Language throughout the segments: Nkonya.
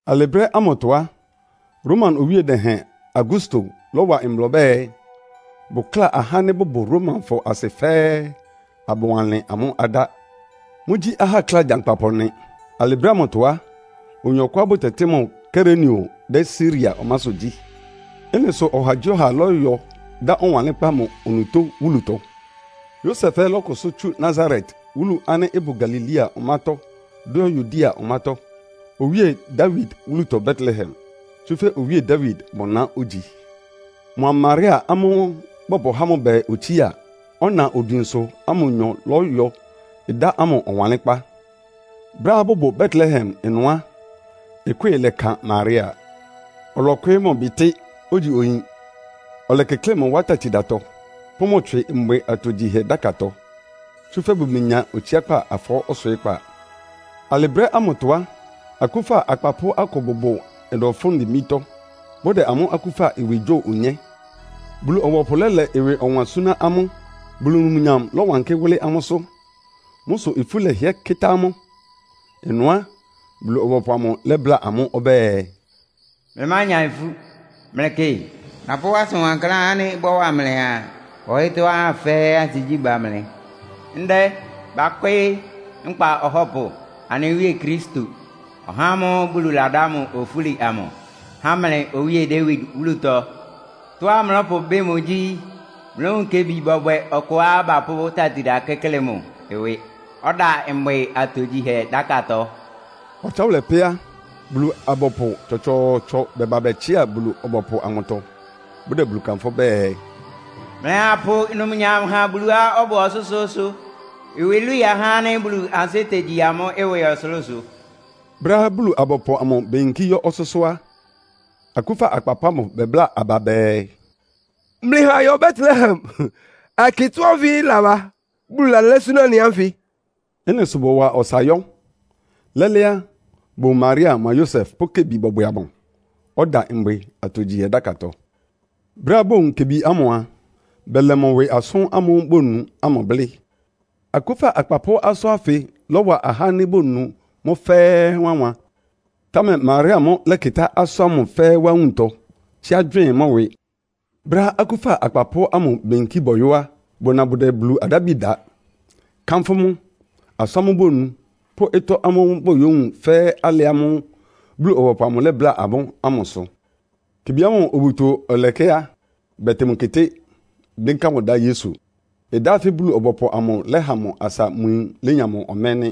Alɩ brɛ́ ámʋtɔ á, Roma owíe dɛhɛn Augusto lɔ́wa mbla ɔbɛ́ɛ, bʋkláa ahá ánɩ́ bʋbʋ Romafɔ asɩ fɛ́ɛ́, abʋwanlɩn amʋ́ adá. Mʋ́gyí ahákla gyankpapʋ nɩ. Alɩ brɛ́ ámʋtɔ á, oyin ɔkʋá bʋtɛtɩ́ mʋ Kirenio dɛ́ Siria ɔmásʋ́ gyí. Ɩ́nɩ sʋ ɔhagyíɔha lɔ́yɔ dá ɔwanlɩ́nkpá mʋ onutó wúlutɔ. Yosef ɛ́ lɔ́kʋsʋ́ tsú Nasaret wúlu ánɩ́ ɩbʋ Galilea ɔmátɔ́ dʋ́ yɔ́ Yudea ɔmátɔ́, Owíe Dawid wúlutɔ Betlehem. Tsúfɛ́ Owíe Dawid mʋ na ógyi. Mʋa Maria amʋ́ʋ́ bapʋ́há mʋ bɛɛ otsía, ɔna odwinsʋ ámʋ nyɔ lɔ́yɔ dá ámʋ ɔwanlɩ́nkpá. Brɛ́á bʋbʋ Betlehem ɩnʋ á, ɩkwɩ́ɩ lɛkan Maria, ɔlɔkwɩɩ́ mʋ bitɩ́, ogyi oyin. Ɔlɛkɩklɩ́ɩ mʋ wá tatidatɔ, pʋ́ mʋ tswɩ mbwɩ atogyihɛ dákatɔ, tsúfɛ́ bʋmenya otsiákpá afɔɔ́ ɔswɩɩ́kpá. Alɩ brɛ́ ámʋtɔ á, akúfa akpapʋ́ akʋ bʋbʋ ɩnʋ fʋ́n dimbítɔ́, bʋdɛ amʋ́ akúfa ɩwɩ gyo onyé. Bulu-ɔbɔpʋ lɛ́lɛ ɩwɩ ɔwan súná amʋ́, Bulu numnyam lɔ́wankɩ́ wʋ́lɩ́ amʋ́sʋ́. Mʋ́ sʋ ifú lɛhɩɛ kɩ́tá amʋ́. Ɩnʋ á, Bulu-ɔbɔpʋ amʋ lɛ́bláa amʋ́ ɔbɛ́ɛ, “Mlɩmánya ifú! Mlɩkɩ, napʋ́ asʋn wankláán ánɩ́ ɩbɔ́wa mlɩa ɔyɩ́tɔ́ ahá fɛ́ɛ́ ansigyí ba mlɩ. Ndɛ bakwɩ́ɩ́ nkpa Ɔhɔ́pʋ, anɩ Wíe Kristo, (ɔhá ámʋ́ʋ́ Bulu ladá mʋ ofúli amʋ) há mlɩ Owíe Dawid wúlutɔ! Tɔ́á mlɔ́pʋbɩ́ mʋ gyí, mlówun kebi bɔbwɛ ɔkʋá bapʋ́ tatida kɩ́klɩ mʋ ɩwɩ, ɔda mbwɩ atogyihɛ dákatɔ.” Ɔtsáwʋlɛ pɛ́ á, Bulu-abɔpʋ tsɔtsɔɔtsɔ bɛba bɛtsɩá Bulu-ɔbɔpʋ amʋtɔ, bʋdɛ Bulu kanfʋ́ bɛɛ, “Mlɩha apʋ numnyam ha Buluá ɔbʋ ɔsʋ́sʋ́ʋ́sʋ́! Ɩwɩ ilwii ahá ánɩ́ Bulu ansɩ́ tegyi amʋ́ ɩwɩ ɔsʋlʋ́sʋ.” Brɛ́á Bulu-abɔpʋ amʋ beyinkí yɔ́ ɔsʋ́sʋ́ á, akúfa akpapʋ́ ámʋ bɛbláa aba bɛɛ, “Mlɩha ayɔ Betlehem, ayɛkɩ ɩtɔ́ ánfɩ ɩlaba, Bulu lalɛ́ súná anɩ ánfɩ.” Ɩ́nɩ sʋ bɔwa ɔsa yɔ́. Lɛ́lɛ́ á, bowun Maria mʋa Yosef pʋ́ kebi bɔbwɛ amʋ, ɔda mbwɩ atogyihɛ dákatɔ. Brɛ́á bowun kebi ámʋ a, bɛlɛ mʋ ɩwɩ asʋ́n ámʋ́ʋ́ bonu ámʋ blɩ́. Akúfa akpapʋ́ asʋ́n ánfɩ lɔ́wa ahá ánɩ́ bonu mʋ́ fɛ́ɛ́ wánwan. Támɛ Maria mʋ́ lɛ́kɩtá asʋ́n ámʋ fɛ́ɛ́ wá nwuntɔ, tsíá gywɩɩ́n mʋ́ ɩwɩ. Brɛ́á akúfa akpapʋ́ ámʋ beyinkí bɔyɔ́ á, bʋna bʋdɛ Bulu adábi da, kánfʋ́ mʋ, asʋ́n ámʋ́ʋ́ bonu pʋ́ ɩtɔ́ ámʋ́ʋ́ bayówun fɛ́ alɩ ámʋ́ʋ́ Bulu-ɔbɔpʋ amʋ lɛ́bláa amʋ́ ámʋ sʋ. Kebi ámʋ obuto ɔlɛkɛ́ á, bɛtɩn mʋ keté, dɩ́nká mʋ dá Yesu. Ɩdá ánfɩ Bulu-ɔbɔpʋ amʋ lɛ́ha mʋ asa mʋ yin lénya mʋ ɔmɛ́ nɩ́.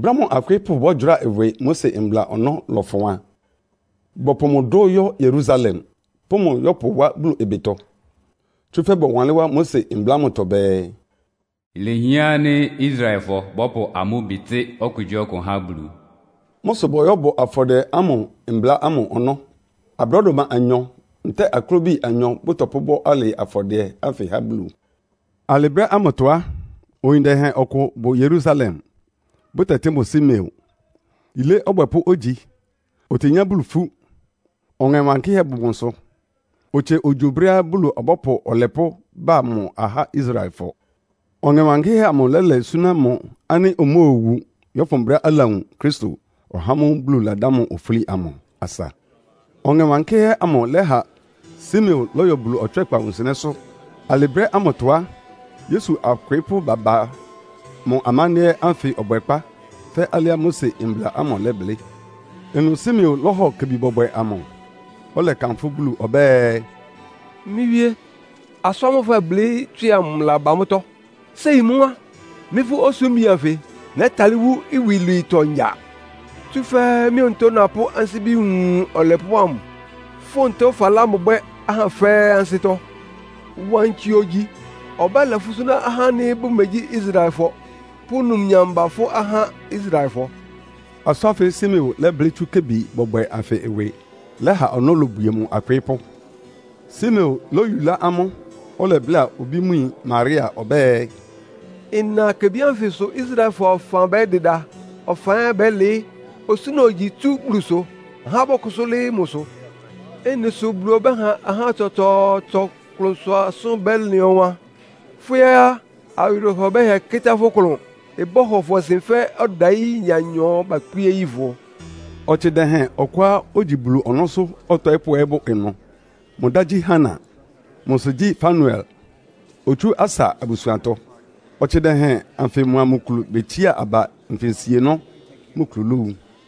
Brɛ́á mʋ akwɩɩ́pʋ́ bɔ́gyʋráa ɩwɩ Mose Mbla ɔnɔ́ lɔfʋn a, bɔpʋ mʋ dʋ́ yɔ́ Yerusalem, pʋ́ mʋ yɔ́pʋ wá Bulu ɩbɩtɔ. (Tsúfɛ́ bɔwanlɩ́n wá Mose Mbla ámʋtɔ bɛɛ, “Ilehián ánɩ́ Israelfɔ bɔ́pʋ amʋ́ bitɩ́ okugyíɔkʋ há Bulu.”) Mʋ́ sʋ bɔyɔ́bɔ afɔdɩɛ ámʋ Mbla ámʋ ɔnɔ́. Abrɔ́dʋma anyɔ ntɛ́ɛ aklobi anyɔ bɔpʋbɔ́ alɩ afɔdɩɛ ánfɩ há Bulu. Alɩ brɛ́ ámʋtɔ á, oyin dɛhɛn ɔkʋ bʋ Yerusalem, bʋtɛtɩ́ mʋ Simeon. Yilé ɔbwɛpʋ́ ógyi, otenyá Bulu ifú. Ɔŋɛ Wankɩ́hɛ́ bʋ mʋsʋ, otsie ogyo brɛ́á Bulu ɔbɔ́pʋ Ɔlɛpʋ́ ba mʋ ahá Israelfɔ. Ɔŋɛ Wankɩ́hɛ́ amʋ lɛ́lɛ súná mʋ ánɩ́ omóowu, yɔ́fʋn brɛ́á alawun Kristo, (ɔhá ámʋ́ʋ́ Bulu ladá mʋ ofúli amʋ) asa. Ɔŋɛ Wankɩ́hɛ́ amʋ lɛ́ha Simeon lɔ́yɔ Bulu ɔtswɛ́kpa wunsɩnɛ́sʋ́. Alɩ brɛ́ ámʋtɔ á, Yesu akwɩɩ́pʋ́ baba mʋ amándɩ́ɛ́ ánfɩ ɔbwɛkpá fɛ́ alɩá Mose Mbla ámʋ lɛblɩ́. Ɩnʋ Simeon lɔ́hɔ kebi bɔbwɛ amʋ, ɔlɛkanfʋ́ Bulu ɔbɛ́ɛ, “Mɩ́ Wíé! Asʋ́n ámʋ́ʋ́ fɛblɩ́ tswɩ amʋ ɩlaba mʋ́tɔ́. Séi mʋ́ á, mɩ́ fʋ́ osúmbi anfɩ nɛ́talɩ́ wú iwilwiitɔ ngya. Tsúfɛ́ mɩ́ onutó napʋ́ mɩ́ ansíbi wun Ɔlɛpʋ́ ámʋ. Fʋ́ onutó falá mʋ bwɛ́ ahá fɛ́ɛ́ ansɩ́tɔ́. Wankɩ ogyi, ɔbɛ́lɛ fʋ́ súná ahá ánɩ́ bʋmegyí Israelfɔ, pʋ́ numnyam ba fʋ́ ahá Israelfɔ.” Asʋ́n ánfɩ Simeon lɛ́blɩ́ tsú kebi bɔbwɛ anfɩ ɩwɩ lɛha ɔnɔ́ lobwie mʋ akwɩɩ́pʋ́. Simeon lóyulá amʋ́, ɔlɛbláa obí mʋ yin Maria ɔbɛ́ɛ, “Ɩna kebi ánfɩ sʋ Israelfɔ ɔfan bɛ́dɩda, ɔfan ɛ́ bɛ́lɩɩ́. Osúna ogyi tsú Bulusʋ, ahá bɔ́kʋsʋ́ lɩ́ɩ́ mʋsʋ. Ɩ́nɩ sʋ Bulu ɔbɛ́ha ahá tsɔtsɔɔtsɔ klʋnsʋ asʋ́n bɛ́lɩn ɔwan. Fʋ́ ɛ́ á, awɩrɛhɔ bɛ́hɩɛ kɩ́tá fʋ́ klʋn. Ɩbɔ́hɔ fʋ ɔsɩn fɛ́ ɔdayí ɩya anyɔ bakpíé yi fʋ.” Ɔtsɩ dɛhɛn ɔkʋá ogyi Bulu ɔnɔ́sʋ́ ɔtɔɩ́pʋ́ ɛ́ bʋ ɩnʋ. Mʋ dá gyí Hana. Mʋ sɩ gyí Fanuel, otsú Asa abusuantɔ. Ɔtsɩ dɛhɛn anfɩ mʋa mʋ kulu betsiá aba nfinsienɔ́, mʋ kulu lówu.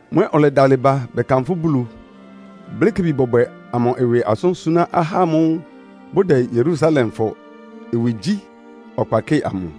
Mʋ ɛ́ ɔlɛdalɩ ba bɛkanfʋ́ Bulu, blɩ́ kebi bɔbwɛ amʋ ɩwɩ asʋ́n súná ahá ámʋ́ʋ́ bʋdɛ Yerusalemfɔ ɩwɩgyí ɔkpa kɩ́ɩ amʋ.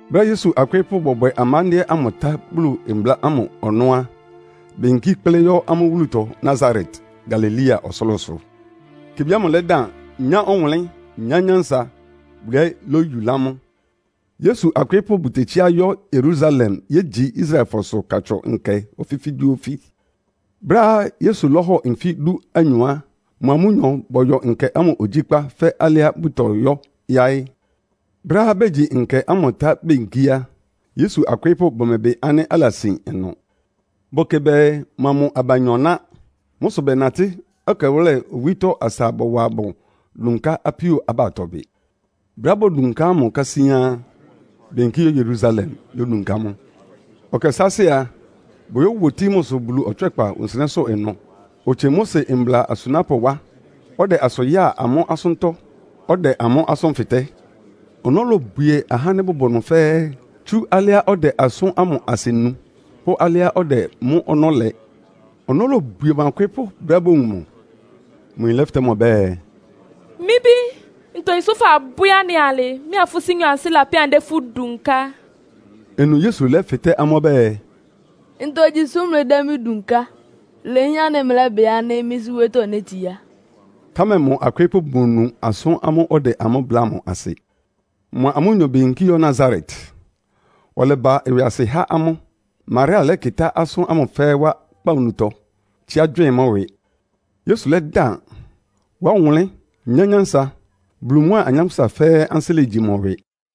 Brɛ́á Yesu akwɩɩ́pʋ́ bɔbwɛ amándɩ́ɛ́ ámʋ tá Bulu mbla ámʋ ɔnɔ́ á, beyinkí kplɩ́ yɔ́ amʋ́ wúlutɔ Nasaret, Galilea ɔsʋlʋ́sʋ. Kebi ámʋ lɛ́dan, nyá ɔwʋnlɩ́n, nyá nyánsa, Bulu ɛ́ lóyulá mʋ. Yesu akwɩɩ́pʋ́ bʋtetsíá yɔ́ Yerusalem yégyi Israelfɔsʋ Katsʋn Nkɛ ofífígyíofí. Brɛ́á Yesu lɔ́hɔ nfí dúanyɔ á, mʋa amʋ́nyɔ bɔyɔ nkɛ ámʋ ogyíkpá fɛ́ alɩá bʋtɔyɔ́ yáɩ́. Brɛ́á begyi nkɛ ámʋ tá beyinkí á, Yesu akwɩɩ́pʋ́ bʋmɛbɩ ánɩ́ alasin ɩnʋ. Bʋkɩ bɛɛ mʋa mʋ abanyɔ ná. Mʋ́ sʋ bɛnatɩ́ ɛkɛwʋ́lɛ owítɔ́ asa bɔwa mʋ dunká apíó abatɔ bɩ. Brɛ́á bodunká mʋ kásíán á, beyinkí yɔ́ Yerusalem, yódunká mʋ. Ɛkɛ sáásɩ́ a, boyówotií mʋsʋ Bulu ɔtswɛ́kpa wunsɩnɛ́sʋ́ ɩnʋ. Otsie Mose mbla asunápʋ́ wá, ɔdɛ asʋ yáa amʋ́ asʋ́ntɔ́, ɔdɛ amʋ́ asʋ́n fɩtɛ́. Ɔnɔ́ lobwie ahá ánɩ́ bʋbʋ ɩnʋ fɛ́ɛ́, tsú alɩá ɔdɛ asʋ́n ámʋ asɩ nu pʋ́ alɩá ɔdɛ mʋ́ ɔnɔ́ lɛ. Ɔnɔ́ lobwie mʋ akwɩɩ́pʋ́ brɛ́á bowun mʋ. Mʋ yin lɛ́fɩtɛ́ mʋ ɔbɛ́ɛ, “Mɩ́ bí, ntogyi sʋ fabwɛ́ anɩ alɩ? Mɩ́a fʋ́ sɩ́nyɔ ansɩ́ lapɛ́ anɩdɛ́ fʋ́ dunká.” Ɩnʋ Yesu lɛ́fɩtɛ́ amʋ́ ɔbɛ́ɛ, “Ntogyi sʋ mlɩdɛ́ mɩ́ dunká? Ilehián ánɩ́ mlɛ́bɩ ánɩ́ mɩ́ Sɩ́ wóyítɔ́ nétsiá.” Támɛ mʋ akwɩɩ́pʋ́ bʋmonu asʋ́n ánɩ́ ɔdɛ amʋ́ bláa asɩ. Mʋa amʋ́nyɔ beyinkí yɔ́ Nasaret, ɔlɛba ɩwɩasɩ há amʋ́. Maria lɛ́kɩtá asʋ́n ámʋ fɛ́ɛ́ wá kpawunutɔ, tsíá gywɩɩ́n mʋ́ ɩwɩ. Yesu lɛ́dan, wa ɔwʋnlɩ́n, nyá nyánsa, Bulu mʋ́a anyánkpʋ́sa fɛ́ɛ́ ansɩ́ legyi mʋ ɩwɩ.